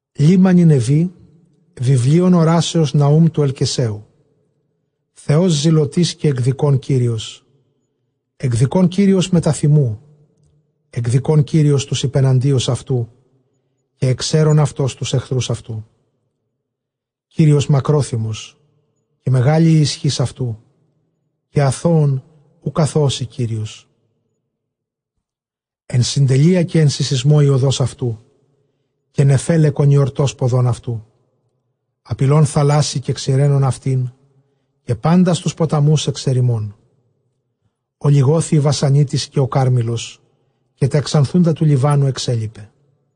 ΛΗΜΜΑ Νινευὴ, βιβλίον ὁράσεως Ναοὺμ τοῦ Ἐλκεσαίου. Θεὸς ζηλωτὴς, καὶ ἐκδικῶν Κύριος, ἐκδικῶν Κύριος μετὰ θυμοῦ, ἐκδικῶν Κύριος τοὺς ὑπεναντίους αὐτοῦ, καὶ ἐξαίρων αὐτὸς τοὺς ἐχθροὺς αὐτοῦ. Κύριος μακρόθυμος, καὶ μεγάλη ἡ ἰσχὺς αὐτοῦ, καὶ ἀθῶον οὐκ ἀθωώσει Κύριος· ἐν συντελείᾳ, καὶ ἐν συσσεισμῷ ἡ ὁδὸς αὐτοῦ, καὶ νεφέλαι κονιορτὸς ποδῶν αὐτοῦ. Ἀπειλῶν θαλάσσῃ, καὶ ξηραίνων αὐτὴν, καὶ πάντας τοὺς ποταμοὺς ἐξερημῶν· ὠλιγώθη ἡ Βασανίτις, καὶ ὁ Κάρμηλος, καὶ τὰ ἐξανθοῦντα τοῦ Λιβάνου ἐξέλιπε.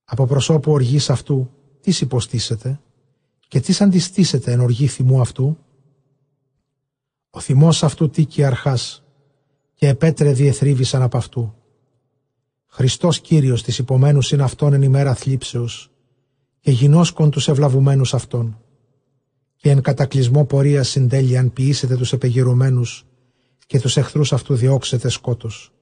Ἀπὸ προσώπου ὀργῆς αὐτοῦ τίς ὑποστήσεται; καὶ τίς ἀντιστήσεται ἐν ὀργῇ θυμοῦ αὐτοῦ; ὁ θυμὸς αὐτοῦ τήκει ἀρχὰς, καὶ αἱ πέτραι διεθρύβησαν ἀπʼ αὐτοῦ. Χρηστὸς Κύριος τοῖς ὑπομένουσιν αὐτὸν ἐν ἡμέρᾳ θλίψεως, καὶ γινώσκων τοὺς εὐλαβουμένους αὐτόν. Καὶ ἐν κατακλυσμῷ πορείας συντέλειαν ποιήσεται, τοὺς ἐπεγειρομένους καὶ τοὺς ἐχθροὺς αὐτοῦ διώξεται σκότος.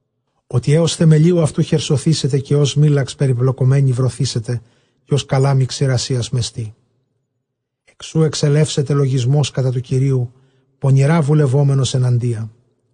Ὅτι ἕως θεμελίου αὐτοῦ χερσωθήσεται· καὶ ὡς σμῖλαξ περιπλεκομένη βρωθήσεται, καὶ ὡς καλάμη ξηρασίας μεστή. Ἐκ σοῦ ἐξελεύσεται λογισμὸς κατὰ τοῦ Κυρίου, πονηρὰ βουλευόμενος ἐναντία.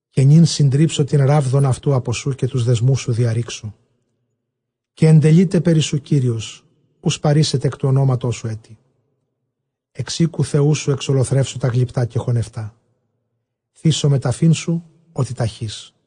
Καὶ νῦν συντρίψω τὴν ῥάβδον αὐτοῦ ἀπὸ σοῦ, καὶ τοὺς δεσμοὺς διαῤῥήξω. Καὶ ἐντελεῖται περὶ σοῦ Κύριος, οὐ σπαρήσεται ἐκ τοῦ ὀνόματός σου ἔτι· ἐξ οἴκου θεοῦ σου ἐξολοθρεύσω τὰ γλυπτὰ, καὶ χωνευτὰ, θήσομαι ταφήν σου, ὅτι ταχεῖς.